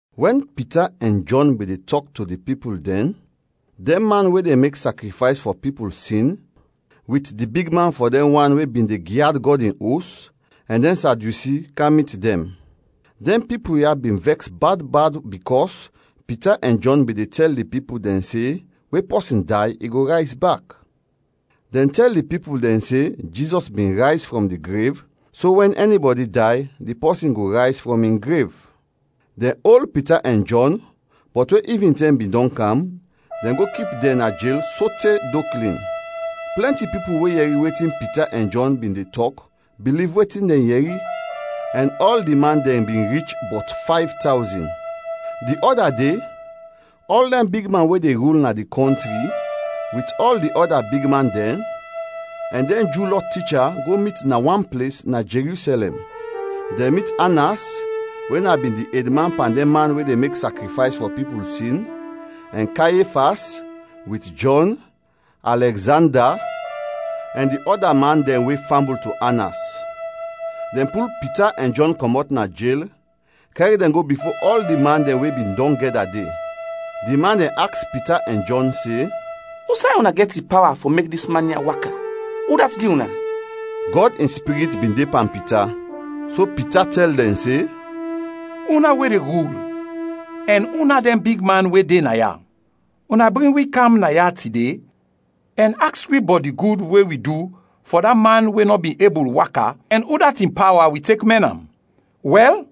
Wɛn Pita ɛn Jɔn bin de tɔk to di pipul dɛn, dɛn man we de mek sakrifays fɔ pipul sin wit di bigman fɔ dɛn wan we bin de gyad Gɔd in Os, ɛn dɛn Sadyusi, kam mit dɛn. Dɛn pipul ya bin vɛks bad bad bikɔs Pita ɛn Jɔn bin de tɛl di pipul dɛn se we pɔsin day, i go rayz bak. Dɛn tɛl di pipul dɛn se Jizɔs bin rayz frɔm di grev, so wɛn ɛnibɔdi day, di pɔsin go rayz frɔm in grev. Dɛn ol Pita ɛn Jɔn, bɔt we ivintɛm bin dɔn kam, dɛn go kip dɛn na jel sote do klin. Plɛnti pipul we yɛri wetin Pita ɛn Jɔn bin de tɔk biliv wetin dɛn yɛri, ɛn ɔl di man dɛn bin rich bɔt fayv tawzin. Di ɔda de, ɔl dɛn bigman we de rul na di kɔntri wit ɔl di ɔda bigman dɛn, ɛn dɛn Ju Lɔ ticha go mit na wan ples na Jerusɛlɛm. Dɛn mit Anas we na bin di edman pan dɛn man we de mek sakrifays fɔ pipul sin, ɛn Kayefas, wit Jɔn, Alɛgzanda, ɛn di ɔda man dɛn we fambul to Anas. Dɛn pul Pita ɛn Jɔn kɔmɔt na jel, kɛr dɛn go bifo ɔl di man dɛn we bin dɔn gɛda de. Di man dɛn aks Pita ɛn Jɔn se, “Usay una gɛt di pawa fɔ mek dis man ya waka? Udat gi una?” Gɔd in Spirit bin de pan Pita, so Pita tɛl dɛn se, “Una we de rul ɛn una dɛn bigman we de naya! Una bring wi kam naya tide ɛn aks wi bɔt di gud we wi du fɔ da man we nɔ bin ebul waka ɛn udat in pawa wi tek mɛn am; wɛl,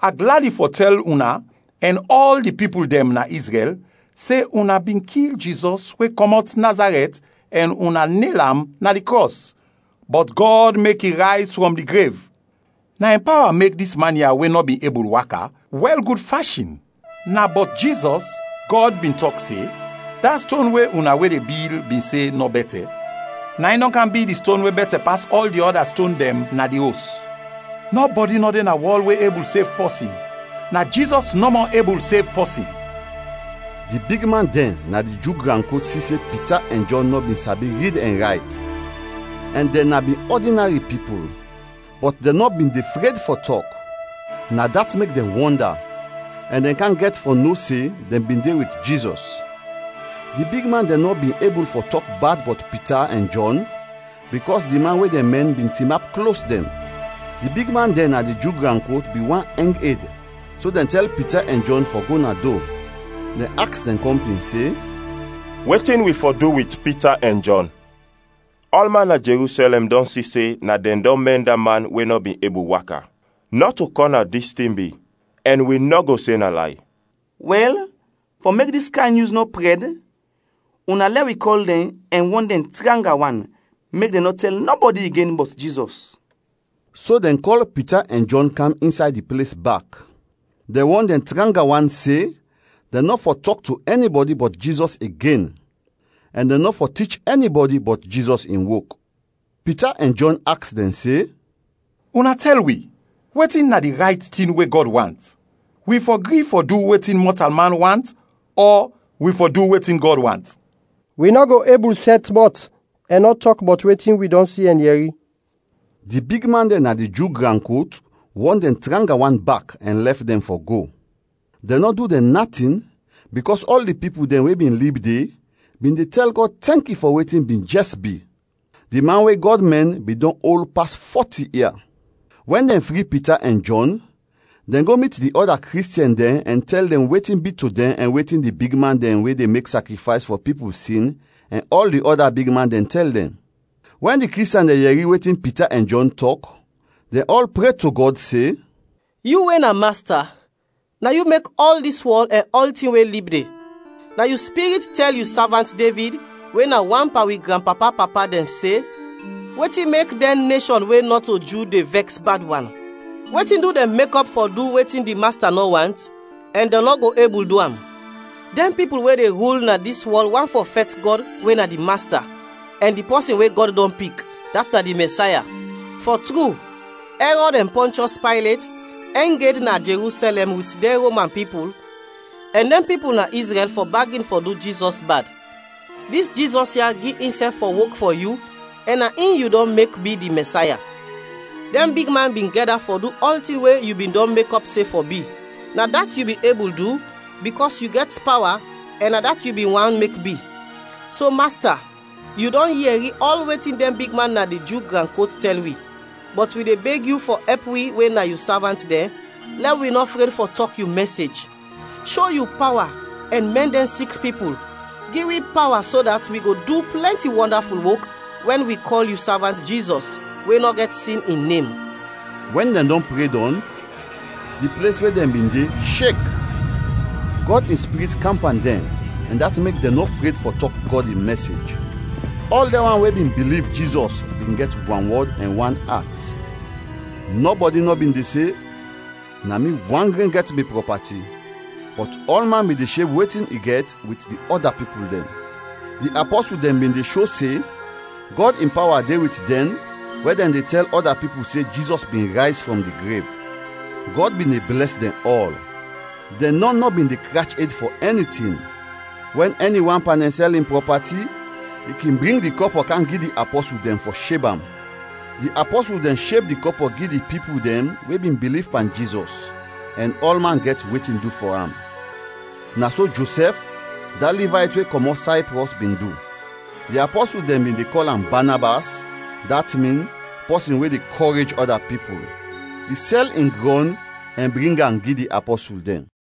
a gladi fɔ tɛl una ɛn ɔl di pipul dɛn na Izrɛl se una bin kil Jizɔs we kɔmɔt Nazarɛt ɛn una nel am na di krɔs, bɔt Gɔd mek i rayz frɔm di grev. Na in pawa mek dis man ya we nɔ bin ebul waka, wɛl gud fashin. Na bɔt Jizɔs, Gɔd bin tɔk se, ‘Da ston we una we de bil bin se nɔ bɛtɛ, na in dɔn kam bi di ston we bɛtɛ pas ɔl di ɔda ston dɛn na di os.’ Nɔbɔdi nɔ de na wɔl we ebul sev pɔsin; na Jizɔs nɔmɔ ebul sev pɔsin.” Di bigman dɛn na di Ju gran kot si se Pita ɛn Jɔn nɔ bin sabi rid ɛn rayt, ɛn dɛn na bin ɔdinari pipul, bɔt dɛn nɔ bin de fred fɔ tɔk. Na dat mek dɛn wɔnda; ɛn dɛn kam gɛt fɔ no se dɛn bin de wit Jizɔs. Di bigman dɛn nɔ bin ebul fɔ tɔk bad bɔt Pita ɛn Jɔn bikɔs di man we dɛn mɛn bin tinap klos dɛn. Di bigman dɛn na di Ju gran kot bin want ɛng ed so dɛn tɛl Pita ɛn Jɔn fɔ go na do. Dɛn aks dɛn kɔmpin se, “Wetin wi fɔ du wit Pita ɛn Jɔn? Ɔlman na Jerusɛlɛm dɔn si se na dɛn dɔn mɛn da man we nɔ bin ebul waka; nɔto kɔna dis tin bi ɛn wi nɔ go se na lay. Wɛl, fɔ mek dis kayn nyus nɔ prɛd, una lɛ wi kɔl dɛn ɛn wɔn dɛn tranga wan mek dɛn nɔ tɛl nɔbɔdi igen bɔt Jizɔs.” So dɛn kɔl Pita ɛn Jɔn kam insay di ples bak. Dɛn wɔn dɛn tranga wan se dɛn nɔ fɔ tɔk to ɛnibɔdi bɔt Jizɔs igen ɛn dɛn nɔ fɔ tich ɛnibɔdi bɔt Jizɔs in wok. Pita ɛn Jɔn aks dɛn se, “Una tɛl wi, wetin na di rayt tin we Gɔd want: wi fɔ gri fɔ du wetin mɔtalman want ɔ wi fɔ du wetin Gɔd want? Wi nɔ go ebul sɛt mɔt ɛn nɔ tɔk bɔt wetin wi dɔn si ɛn yɛri.” Di bigman dɛn na di Ju gran kot wɔn dɛn tranga wan bak ɛn lɛf dɛn fɔ go. Dɛn nɔ du dɛn natin, bikɔs ɔl di pipul dɛn we bin lib de bin de tɛl Gɔd tɛnki fɔ wetin bin jɛs bi. Di man we Gɔd mɛn bin dɔn ol pas fɔti ia. Wɛn dɛn fri Pita ɛn Jɔn, dɛn go mit di ɔda Kristiɛn dɛn ɛn tɛl dɛn wetin bi to dɛn ɛn wetin di bigman dɛn we de mek sakrifays fɔ pipul sin ɛn ɔl di ɔda bigman dɛn tɛl dɛn. Wɛn di Kristiɛn dɛn yɛri wetin Pita ɛn Jɔn tɔk, dɛn ɔl pre to Gɔd se, “Yu we na Masta, na yu mek ɔl dis wɔl ɛn ɔltin we lib de. Na yu Spirit tɛl yu savant Devid we na wan pan wi granpapa-papa dɛn se, ‘Wetin mek dɛn neshɔn we nɔto Ju de vɛks bad wan? Wetin du dɛn mekɔp fɔ du wetin di Masta nɔ want ɛn dɛn nɔ go ebul du am? Dɛn pipul we de rul na dis wɔl want fɔ fɛt Gɔd we na di Masta ɛn di pɔsin we Gɔd dɔn pik, dat na di Mɛsaya.’ Fɔ tru, Ɛrɔd ɛn Pɔnchɔs Paylet ɛng ed na Jerusɛlɛm wit dɛn Roman pipul ɛn dɛn pipul na Izrɛl fɔ bagin fɔ du Jizɔs bad. Dis Jizɔs ya gi insɛf fɔ wok fɔ yu ɛn na in yu dɔn mek bi di Mɛsaya. Dɛn bigman bin gɛda fɔ du ɔltin we yu bin dɔn mekɔp se fɔ bi. Na dat yu bin ebul du bikɔs yu gɛt pawa ɛn na dat yu bin want mek bi. So, Masta, yu dɔn yɛri ɔl wetin dɛn bigman na di Ju gran kot tɛl wi, bɔt wi de beg yu fɔ ɛp wi we na yu savant dɛn lɛ wi nɔ fred fɔ tɔk yu mɛsej. Sho yu pawa ɛn mɛn dɛn sik pipul. Gi wi pawa so dat wi go du plɛnti wɔndaful wok wɛn wi kɔl yu Savant Jizɔs, we nɔ gɛt sin, in nem.” Wɛn dɛn dɔn pre dɔn, di ples we dɛn bin de, shek. Gɔd in Spirit kam pan dɛn ɛn dat mek dɛn nɔ fred fɔ tɔk Gɔd in mɛsej. Ɔl dɛn wan we bin biliv Jizɔs bin gɛt wanwɔd ɛn wan at. Nɔbɔdi nɔ bin de se, “Na mi wan gren gɛt mi prɔpati”, bɔt ɔlman bin de sheb wetin i gɛt wit di ɔda pipul dɛn. Di apɔsul dɛn bin de sho se Gɔd in pawa de wit dɛn wɛn dɛn de tɛl ɔda pipul se Jizɔs bin rayz frɔm di grev. Gɔd bin de blɛs dɛn ɔl. Dɛn nɔn nɔ bin de krach ed fɔ ɛni tin. Wɛn ɛni wan pan dɛn sɛl in prɔpati, i kin bring di kɔpɔ kam gi di apɔsul dɛn fɔ sheb am. Di apɔsul dɛn sheb di kɔpɔ gi di pipul dɛn we bin biliv pan Jizɔs ɛn ɔlman gɛt wetin du fɔ am. Na so Josɛf, da Livayt we kɔmɔt Sayprɔs, bin du. Di apɔsul dɛn bin de kɔl am Banabas, dat min “Pɔsin we de kɔrej ɔda pipul”. I sɛl in grɔn ɛn bring am gi di apɔsul dɛn.